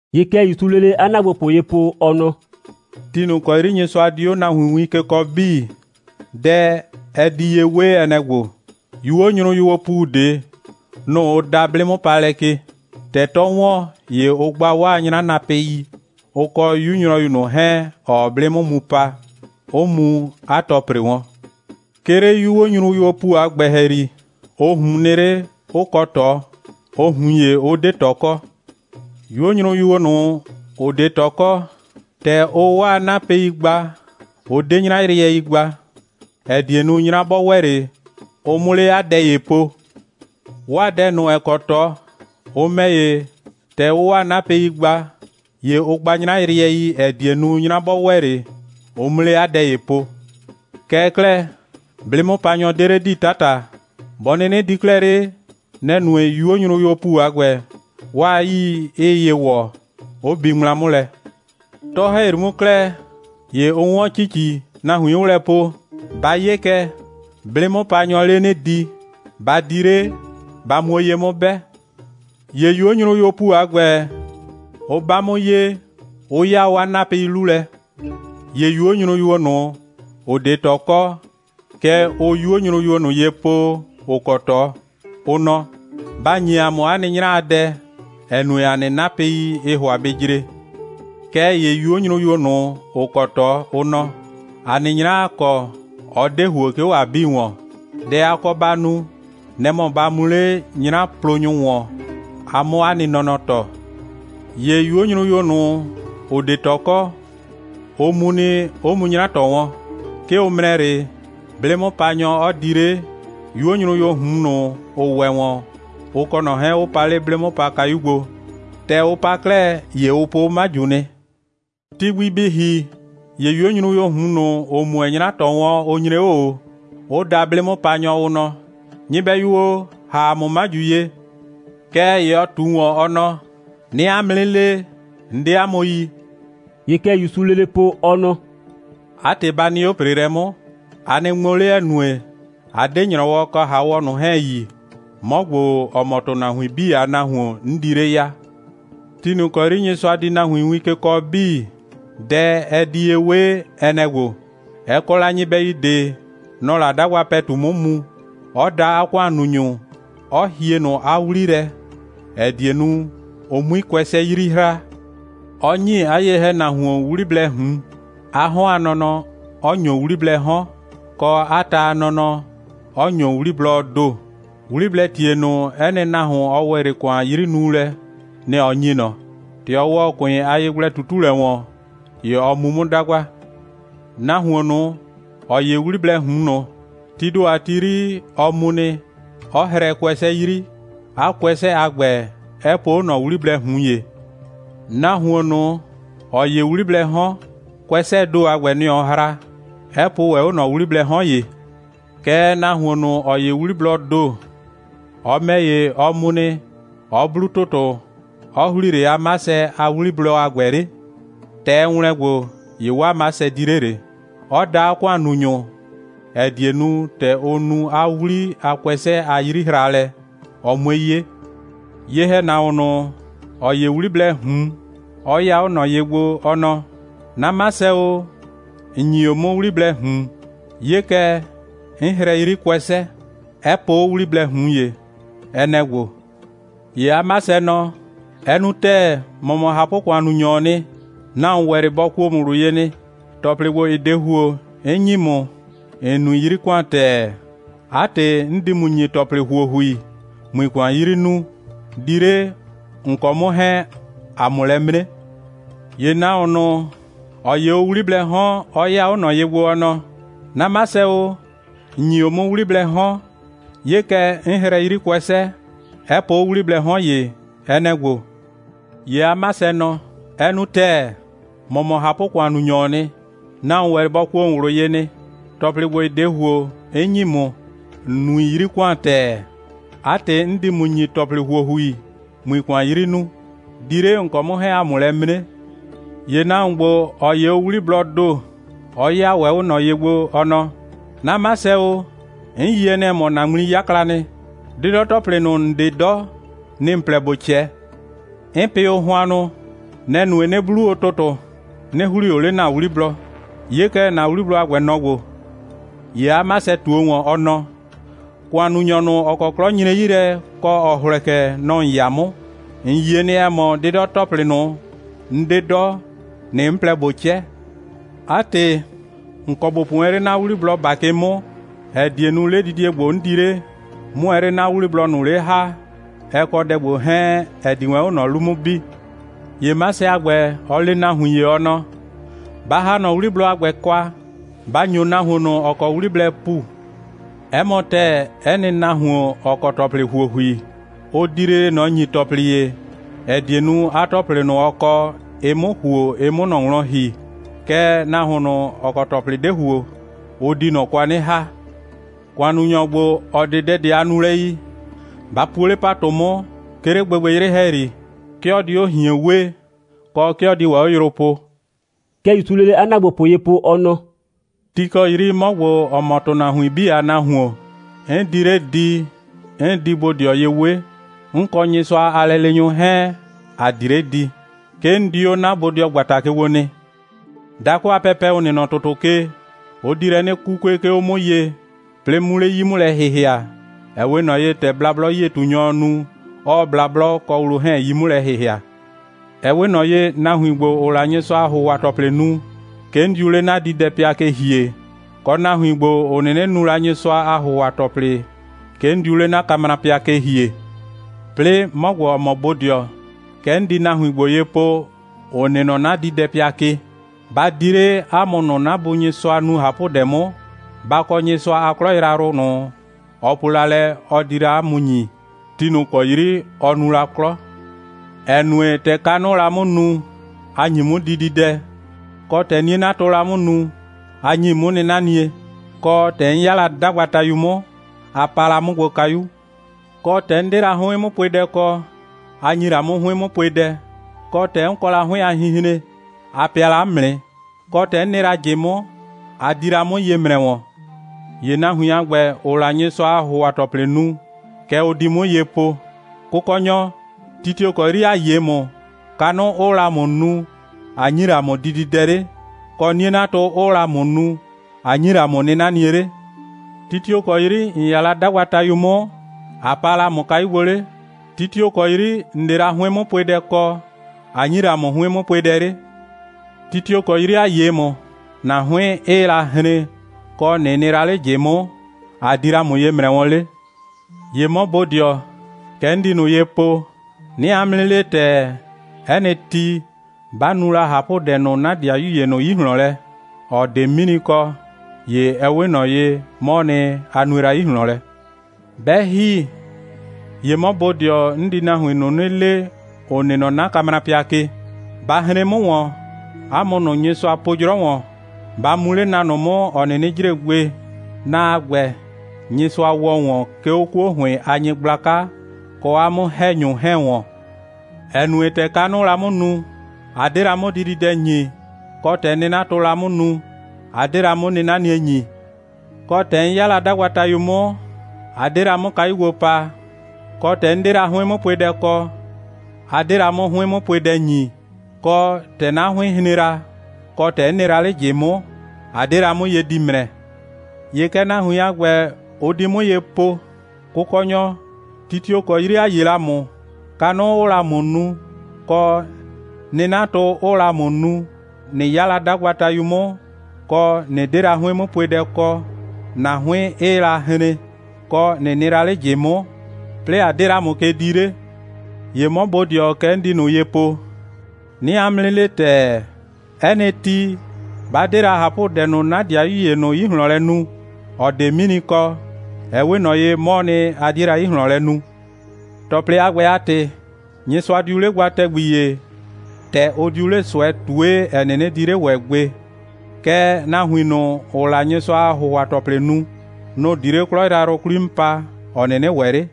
(‑Ye kɛ ‑Yusuu lele 'a ‑naagbopʋ ye po, ɔ nɔ:) «Ti ꞊nʋ ‑kɔ 'yri Nyɩsʋa di 'o nahuin win ke kɔɔ 'bii, dɛ, ɛ di ye 'we, ɛ nɛ‑ ‑gbo: 'Yuo nyrʋyuoo ‑pu ꞊de, nʋ‑ ʋ da 'blɩ'mʋpaalɛ ke. ‑Tɛ 'tɔɔ ‑wɔn, ‑ye ʋ gba 'waa 'nyranapɩi, ʋ kɔ 'yu nyrɔyu ꞊nʋ 'hɛɛn, ‑ɔɔ 'blɩ 'mʋ mu pa, 'ʋ mu 'a tɔ ‑pre wɔn. 'Ke 'le 'yuo nyrʋyuoo ‑pu a ‑gbɛ ‑hɛyri, ʋ ꞊hun nɩ 'le, 'ʋ kɔ ꞊tɔ, ʋ ꞊hun ‑ye 'ʋ 'de ꞊tɔ kɔ. 'Yuo nyrʋyuo ꞊nʋ, ‑ʋ 'de ꞊tɔ kɔ, ‑tɛ ʋʋ 'waa nɩ 'napɩi gba, ʋ 'de 'nyrayrɩɛi gba, ‑ɛ die nu, 'nyra 'bɔ ‑wɛ 'le, ʋ 'mʋ 'le 'a dɛ ‑ye po. 'Waa dɛ ꞊nʋ, ‑ɛ kɔ ꞊tɔ, ʋ ‑mɛ ‑ye, ‑tɛ ʋʋ 'waa 'napɩi gba, ‑ye ʋ gba 'nyrayrɩɛi, ‑ɛ die nu, 'nyra 'bɔ ‑wɛ 'le, ʋ 'mʋ 'le 'a dɛ ‑ye po. Kɛɛ 'klɛɛ, 'blɩ'mʋpanyɔ 'de 'le di 'tata. Bɔ 'nɩnɩ di 'klɛɛ 'le, nɛ‑ nue, 'yuo nyrʋyuoo ‑pu a ‑gbɛ, 'waa 'yii 'ɩɩ ye ‑wɔ, 'ʋ bi ŋmla 'mʋ lɛ. 'Tɔ‑hɛyri 'mʋ 'klɛɛ, ‑ye ʋ 'wɔn ‑cici, nahuin 'ʋʋ lɛ po: Ba 'ye kɛ, 'blɩ'mʋpanyɔɔ 'le 'nɩ di, ba di 'le, ba muo ye 'mʋ 'bɛ! ‑Ye 'yuo nyrʋyuoo ‑pu a ‑gbɛ, ʋ 'ba 'mʋ ye, 'ʋ 'yaa 'waa 'napɩi 'lu lɛ. ‑Ye 'yuo nyrʋyuo ꞊nʋ, ‑ʋ 'de ꞊tɔ kɔ, kɛ ʋʋ 'yuo nyrʋyuo ꞊nʋ ye po, ‑ʋ kɔ ꞊tɔ, ʋ nɔ: Ba ‑nyi ‑a mʋ 'a nɩ 'nyra a dɛ, ‑ɛ nue, ‑a nɩ 'napɩi, ɩɩ ‑hʋa bɩ jre. Kɛɛ ‑ye 'yuo nyrʋyuo ꞊nʋ, ‑ʋ kɔ ꞊tɔ, ʋ nɔ: ‑A nɩ 'nyra, ‑a kɔ, ɔ 'de ‑huo, 'ke 'o ‑a 'bii ‑wɔn. Dɛ a kɔ ba nu, nɛ‑ mɔ, ba mu 'le 'nyraplonyʋ ‑wɔn, a 'mʋ 'a nɩ nɔnɔ ‑tɔ! ‑Ye 'yuo nyrʋyuo ꞊nʋ, ‑ʋ 'de ꞊tɔ kɔ, ʋ mu nɩ, 'ʋ mu 'nyra ‑tɔ wɔn. 'Ke ʋ ‑mrɛ 'le, 'blɩ'mʋpanyɔ 'ɔ di 'le, 'yuo nyrʋyuo ꞊hun ꞊nʋ, ‑ʋ ‑wɛ ‑wɔn, ʋ kɔ ꞊nɔ 'hɛɛn, 'ʋ pa 'le 'blɩ'mʋpakayu gbo. ‑Tɛ ʋ pa 'klɛɛ, ‑ye ʋ po 'o 'maju nɩ. Ti gbi bɩ ‑hi, ‑ye 'yuo nyrʋyuoo ꞊hun ꞊nʋ, ‑ʋ mu wɛn 'nyra ‑tɔ wɔn, ʋ nyre 'o ꞊o, 'ʋ da 'blɩ'mʋpanyɔ, ʋ nɔ: Nyɩbɛyu o, ‑ha ‑a mʋ 'maju ye! Kɛɛ ‑ye ɔ ꞊tu ‑wɔn, ɔ nɔ: 'Nɩɩ 'a mʋ 'nɩ le, 'n 'de 'a mʋ yi.» ‑Ye kɛ ‑Yusuu lele po, ɔ nɔ: «'A ‑tɩ, ba nɩ 'o ‑preelɛ 'mʋ, a nɩ ŋmo 'le, ‑ɛ nue, a 'de ‑nyrɔwɔ kɔ ‑haawɔ ꞊nʋ 'hɛɛn yi, 'mɔ ‑gbo, ‑ɔ mɔ ‑tʋnahuin 'bii a Nahuon, 'n di 'le ya.» «Ti ꞊nʋ ‑kɔ 'yri Nyɩsʋa di nahuin win ke kɔɔ 'bii, dɛ, ɛ di ye 'we, ɛ nɛ‑ ‑gbo: Ɛ kɔ la nyɩbɛyu ꞊de, nɔ‑ɔ la 'dagba ‑pɛtu 'mʋ mu, 'ɔ da 'a ‑kʋannunyʋ, 'ɔ hie ꞊nʋ 'a 'wli lɛ, ‑ɛ die nu, ʋ 'mui kʋɛsɛ 'yri hraa; 'ɔ ‑nyi 'a ye‑hɛnahuon 'wliblɛɛ ꞊hun, 'a 'hɔn a nɔnɔ, 'ɔ ‑nyo 'wliblɛɛ 'hɔn, kɔ, 'a ta a nɔnɔ, 'ɔ ‑nyo 'wliblɔɔ ‑do. 'Wliblɛɛ ‑tie ꞊nʋ, 'ɛ nɩ nahuon, ɔ ‑wɛ 'le ‑kʋan a 'yrinuulɛ, nɛ‑ ɔ ‑nyi ꞊nɔ. ‑Tɛ ɔ ‑wɔ ‑kʋɩn a yegblɛ꞊tutulɛ ‑wɔn, ‑ye ɔ mu 'mʋ 'dagba. Nahuon ꞊nʋ, ‑ɔ 'ye 'wliblɛɛ ꞊hun ꞊nʋ, tii ‑do a ti 'yri, ɔ mu nɩ, 'ɔ hrɛɛ kʋɛsɛ 'yri, 'a kʋɛsɛ a ‑gbɛ, 'ɛ po 'o ꞊nɔ 'wliblɛɛ ꞊hun ‑ye. Nahuon ꞊nʋ, ‑ɔ 'ye 'wliblɛɛ 'hɔn, kʋɛsɛɛ ‑do a ‑gbɛ, nɛ‑ ɔ hra, 'ɛ po ‑wɛ 'o ꞊nɔ 'wliblɛɛ 'hɔn ‑ye. Kɛɛ, nahuon ꞊nʋ, ‑ɔ 'ye 'wliblɔɔ ‑do, ɔ ‑mɛ ‑ye, ɔ mu nɩ, 'ɔ 'blu ‑tʋtʋ, 'ɔ ‑hlii 'le 'a 'masɛ a 'wliblɔ a ‑gbɛ 'le. ‑Tɛ ɛ ‑wlɛn gbo, ‑ye 'waa 'masɛ di 'le ꞊le, 'ɔ da 'a ‑kʋannunyʋ, ‑ɛ die nu, ‑tɛ ʋ nu 'a 'wli a kʋɛsɛ a 'yrihraalɛ, ɔ 'mue 'ye. ‑Ye nahuon ꞊nʋ, ‑ɔ 'ye o 'wliblɛɛ ꞊hun, ɔ 'yɩya 'o ꞊nɔ ye gbo, ɔ nɔ: 'Na 'masɛ o, ‑n ‑nyi o 'mʋ 'wliblɛɛ ꞊hun. 'Ye kɛ, 'n hrɛɛ 'yri kʋɛsɛ, 'ɛ po 'o 'wliblɛɛ ꞊hun ‑ye. Ɛ nɛ‑ ‑gbo. ‑Ye 'a 'masɛ nɔ: Ɛ nu ‑tɛɛ. ‑Mɔ mɔ ꞊hapʋ‑kʋannunyɔɔ nɩ. Nahuon ‑wɛ 'le bɔ kuo ‑mʋ ꞊wlʋ ye nɩ. ‑Tɔplɩ ‑gbo, ‑ɩ 'de ‑huo, 'n ‑nyi ‑mʋ, ‑n nui 'yri ‑kʋan ‑tɛɛ. 'A ‑tɩ, 'n di ‑mʋ ‑nyi ‑tɔplɩ ‑huohui, ꞊mui ‑kʋan 'yri nuu. Di 'le, ‑n kɔ 'mʋ 'hɛɛn, ‑a 'mʋ lɛ 'mre. ‑Ye nahuon ꞊nʋ, ‑ɔ 'ye o 'wliblɛɛ 'hɔn, ɔ 'yɩya 'o ꞊nɔ ye gbo, ɔ nɔ: 'Na 'masɛ o, ‑n ‑nyi o 'mʋ 'wliblɛɛ 'hɔn. 'Ye kɛ, 'n hrɛɛ 'yri kʋɛsɛ, 'ɛ po 'o 'wliblɛɛ 'hɔn ‑ye. Ɛ nɛ‑ ‑gbo. ‑Ye 'a 'masɛ nɔ: Ɛ nu ‑tɛɛ. ‑Mɔ mɔ ꞊hapʋ‑kʋannunyɔɔ nɩ. Nahuon ‑wɛ 'le bɔ kuo ‑mʋ ꞊wlʋ ye nɩ. ‑Tɔplɩ ‑gbo, ‑ɩ 'de ‑huo, 'n ‑nyi ‑mʋ, ‑n nui 'yri ‑kʋan ‑tɛɛ. 'A ‑tɩ, 'n di ‑mʋ ‑nyi ‑tɔplɩ ‑huohui, ꞊mui ‑kʋan 'yri nuu. Di 'le, ‑n kɔ 'mʋ 'hɛɛn, ‑a 'mʋ lɛ 'mre. ‑Ye nahuon ‑gbo, ‑ɔ 'ye o 'wliblɔɔ ‑do, ɔ 'yɩya ‑wɛ 'o ꞊nɔ ye gbo, ɔ nɔ: 'Na 'masɛ o, 'n yie nɩ, ‑ɛ mɔ, ‑na ŋmli 'yakla nɩ. 'Dɩdɔ‑tɔplɩ ꞊nʋ, ‑n 'de 'dɔ, nɩ‑ ‑n plɛ ‑bo 'cɛ. 'N pɩ o hʋannʋ. Nɛ‑ nue, 'nɩ 'blu o ‑tʋtʋ, 'nɩ ‑hlii o 'le ‑na 'wliblɔ. 'Ye kɛ, ‑na 'wliblɔ a ‑gbɛ, nɔ‑ ‑gbo. ‑Ye 'a 'masɛ ꞊tuo ‑wɔn, ɔ nɔ: ‑Kʋannunyɔ ꞊nʋ, ‑ɔ kɔ 'klɔ nyre 'yi lɛ, kɔ, ‑ɔ hlɛkɛ, nɔ‑ ‑n 'ya 'mʋ. ‑N yie nɩ, ‑ɛ mɔ, 'dɩdɔ‑tɔplɩ ꞊nʋ, 'n 'de 'dɔ, nɩ‑ 'n plɛ ꞊bo 'cɛ. 'A ‑tɩ, ‑n kɔ ‑bo po wɛn 'le 'na 'wliblɔ ‑bakɩ 'mʋ, ‑ɛ die nu, 'ledidie ‑gbo, 'n di 'le, 'mʋ wɛn 'le 'na 'wliblɔ ꞊nʋ 'le ‑ha, ɛ kɔ dɛ ‑gbo 'hɛɛn, ‑ɛ di wɛn 'o ꞊nɔ 'lu 'mʋ bi. ‑Ye 'masɛ a ‑gbɛ, ɔ le 'a nahuin ‑ye, ɔ nɔ: Ba ‑ha ꞊nɔ 'wliblɔ a ‑gbɛ kwa, ba ‑nyo nahuon ꞊nʋ, ‑ɔ kɔ 'wliblɛɛ ‑pu. 'Ɛ mɔ ‑tɛɛ, 'ɛ nɩ nahuon, ‑ɔ kɔ ‑tɔplɩ ‑huohui, ʋ di lele ꞊nɔ ‑nyi ‑tɔplɩ ‑ye, ‑ɛ die nu, 'a ‑tɔplɩ ꞊nʋ, ɔ kɔ, ɩ 'mʋ ‑huo, ɩ 'mʋ ꞊nɔ wlɔn ‑hi. Kɛɛ, nahuon ꞊nʋ, ‑ɔ kɔ ‑tɔplɩ 'de ‑huo, ʋ di ꞊nɔ kwa 'nɩ ‑ha. ‑Kʋannunyɔ ‑gbo, ‑ɔ 'de dɛ ꞊de a nulɛ yi, ba puo 'le ‑patʋ 'mʋ, 'ke 'le gbɩgbɩyrɩ ‑hɛyri. 'Ke ɔ di 'o ꞊hien wee, kɔ, 'ke ɔ di ‑wɛ 'o yrʋ poo.» (Kɛ ‑Yusuu lele 'a ‑naagbopʋ ye po, ɔ nɔ:) «Ti ‑kɔ ti 'yri 'mɔ ‑gbo, ‑ɔ mɔ ‑tʋnahuin 'bii a Nahuon, 'n di 'le di, 'n di bodɩɔ ye 'we. 'N kɔ Nyɩsʋa a lɛleenyʋ 'hɛɛn, ‑a di 'le di. 'Ke 'n di 'o 'na bodɩɔgbata ke gbo nɩ. Dakʋ a pɛpɛ, ‑ʋ nɩ nɔ ‑tʋtʋ ke, ʋ di lɛ 'nɩ 'kukue, 'ke 'o 'mʋ ye, 'plɩɩ 'mu 'yi 'mʋ lɛ ‑hɩhɩa, ‑ɛ 'we ꞊nɔ ye, ‑tɛ blablɔ'yie꞊tunyɔɔ nu, 'ɔɔ blablɔ kɔ wlo 'hɛɛn 'yi 'mʋ lɛ ‑hɩhɩa. Ɛ 'we ꞊nɔ ye, nahuin ‑gbo, ‑ʋʋ la Nyɩsʋa a ‑hʋhʋa‑tɔplɩ nu, 'ke 'n diu 'le 'na diidɛpɩa ke ‑hie, kɔ, nahuin ‑gbo, ‑ʋ 'nɩnɩ nu la Nyɩsʋa a ‑hʋhʋa‑tɔplɩ, 'ke 'n diu 'le 'na kamrapɩa ke ‑hie. 'Plɩɩ 'mɔ ‑gbo, ‑ɔ mɔ bodɩɔ, kɛ 'n di nahuin ‑gbo ye po, ‑ʋ nɩ nɔ 'na diidɛpɩa ke: Ba di 'le, 'a mʋ ꞊nʋ, 'na Bu Nyɩsʋa nu ꞊hapʋdɛ 'mʋ, ba kɔ Nyɩsʋa a 'klɔ yrayrʋ ꞊nʋ, ɔ po la lɛ, ɔ di la 'a mʋ ‑nyi, ti ꞊nʋ ‑kɔ 'yri ɔ nu la 'klɔ. ‑Ɛ nue, ‑tɛ kanʋʋ la 'mʋ nu, a ‑nyi 'mʋ dididɛ; kɔ, ‑tɛ 'nie'natʋʋ la 'mʋ nu, a ‑nyi 'mʋ 'nɩnanie; kɔ, ‑tɛ 'n 'ya la 'dagbatayu 'mʋ, a paa la 'mʋ gbo kayu; kɔ, ‑tɛ 'n 'de la 'hʋɩn'mʋpuedɛ kɔ, a ‑nyi la 'mʋ 'hʋɩn'mʋpuedɛ; kɔ, ‑tɛ 'n kɔ la 'hʋɩn a hinhren, a pɩa la 'mʋ nɩ; kɔ, ‑tɛ 'n nɩ la ꞊jɩ 'mʋ, a di la 'mʋ ye ‑mrɛ wɔn. ‑Ye nahuin a ‑gbɛ, ‑ʋʋ la Nyɩsʋa a ‑hʋhʋa‑tɔplɩ nu, kɛ ʋ di 'mʋ ye po: Kʋkɔnyɔ, ti tio‑ kɔ 'yri ‑a 'ye ‑mʋ, kanʋ 'ʋʋ la ‑mʋ nu, ꞊a ‑nyi la ‑mʋ dididɛ 'le; kɔ, 'nie'natʋ 'ʋʋ la ‑mʋ nu, ꞊a ‑nyi la ‑mʋ 'nɩnanie 'le? Ti tio‑ kɔ 'yri ‑n 'ya la 'dagbatayu 'mʋ, ꞊a paa la ‑mʋ kayu gbo 'le? Ti tio‑ kɔ 'yri, ‑n 'de la 'hʋɩn'mʋpuedɛ kɔ, ꞊a ‑nyi la ‑mʋ 'hʋɩn'mʋpuedɛ 'le? Ti tio‑ kɔ 'yri ‑a 'ye ‑mʋ, ‑na 'hʋɩn 'ɩɩ la hren, kɔ, ꞊nɩ nɩ la 'le ꞊jɩ 'mʋ, ꞊a di la ‑mʋ ye ‑mrɛ wɔn 'le? ‑Ye 'mɔ bodɩɔ, kɛ 'n di ꞊nʋ ye po: 'Nɩɩ 'a mʋ 'nɩ le ‑tɛɛ, 'ɛ nɩ ti, 'ba nu la ꞊hapʋdɛ ꞊nʋ 'na ‑dɩayu ‑ye ꞊nʋ 'yi ꞊hlɔn lɛ, ‑ɔ 'de 'mini kɔ, ‑ye ɛ 'we ꞊nɔ ye, 'mɔɔ nɩ, a nue la 'yi ꞊hlɔn lɛ. 'Bɛ ‑hi, ‑ye 'mɔ bodɩɔ, 'n di nahuin ꞊nʋ 'nɩ le, ‑ʋ nɩ nɔ 'na kamrapɩa ke: Ba hren 'mʋ ‑wɔn, 'a mʋ ꞊nʋ, Nyɩsʋa po 'jrɔ ‑wɔn. Ba mu 'le na ꞊nʋ 'mʋ, ‑ɔ 'nɩnɩ jre gbe. Na a ‑gbɛ, Nyɩsʋa ‑wɔ ‑wɔn, 'ke 'o 'kuo ‑hʋɩn a nyɩgblaka, kɔ 'a 'mʋ‑hɛnyʋ 'hɛɛn ‑wɔn. ‑Ɛ nue, ‑tɛ kanʋʋ la 'mʋ nu, a 'de la 'mʋ dididɛ ‑nyi; kɔ, ‑tɛ 'nɩnatʋʋ la 'mʋ nu, a 'de la 'mʋ 'nɩnanie ‑nyi; kɔ, ‑tɛ 'n 'ya la 'dagbatayu 'mʋ, a 'de la 'mʋ kayu gbo paa; kɔ, ‑tɛ 'n 'de la 'hʋɩn'mʋpuedɛ kɔ, a 'de la 'mʋ 'hʋɩn'mʋpuedɛ ‑nyi, kɔ, ‑tɛ 'na 'hʋɩɩn la hren, kɔ, ‑tɛ 'n nɩ la 'le ꞊jɩ 'mʋ, a 'de la 'mʋ ye di ‑mrɛ. ‑Ye kɛ nahuin a ‑gbɛ, ʋ di 'mʋ ye po: Kʋkɔnyɔ, ti tio‑ kɔ 'yri ‑a 'ye la ‑mʋ, kanʋ 'ʋʋ la ‑mʋ nu, kɔ, 'nɩnatʋ 'ʋʋ la ‑mʋ nu, ꞊nɩ 'ya la 'dagbatayu 'mʋ, kɔ, ꞊nɩ 'de la 'hʋɩn'mʋpuedɛ kɔ, ‑na 'hʋɩn 'ɩɩ la hren, kɔ, ꞊nɩ nɩ la 'le ꞊jɩ 'mʋ, 'plɩɩ ꞊a 'de la ‑mʋ ke dii 'le? ‑Ye 'mɔ bodɩɔ, kɛ 'n di ꞊nʋ ye po: 'Nɩɩ 'a mʋ 'nɩ le ‑tɛɛ, 'ɛ nɩ ti, 'ba 'de la ꞊hapʋdɛ ꞊nʋ 'na ‑dɩayu ‑ye ꞊nʋ 'yi ꞊hlɔn lɛ nu, ‑ɔ 'de 'mini kɔ, ɛ 'we ꞊nɔ ye, 'mɔɔ nɩ, a 'die la 'yi ꞊hlɔn lɛ nu. ‑Tɔplɩ a ‑gbɛ a ‑tɩ, Nyɩsʋa diu 'le gba ‑tɛgbi ‑ye, ‑tɛ ʋ diu 'le ꞊sʋɛ ꞊tue, ‑ɛ 'nɩnɩ di 'le ‑wɛ gbe. Kɛɛ, nahuin ꞊nʋ, ‑ʋʋ la Nyɩsʋa a ‑hʋhʋa‑tɔplɩ nu, nʋ‑ di 'le 'klɔ yrayrʋ 'kwli 'mʋ pa, ‑ɔ 'nɩnɩ ‑wɛ 'le.»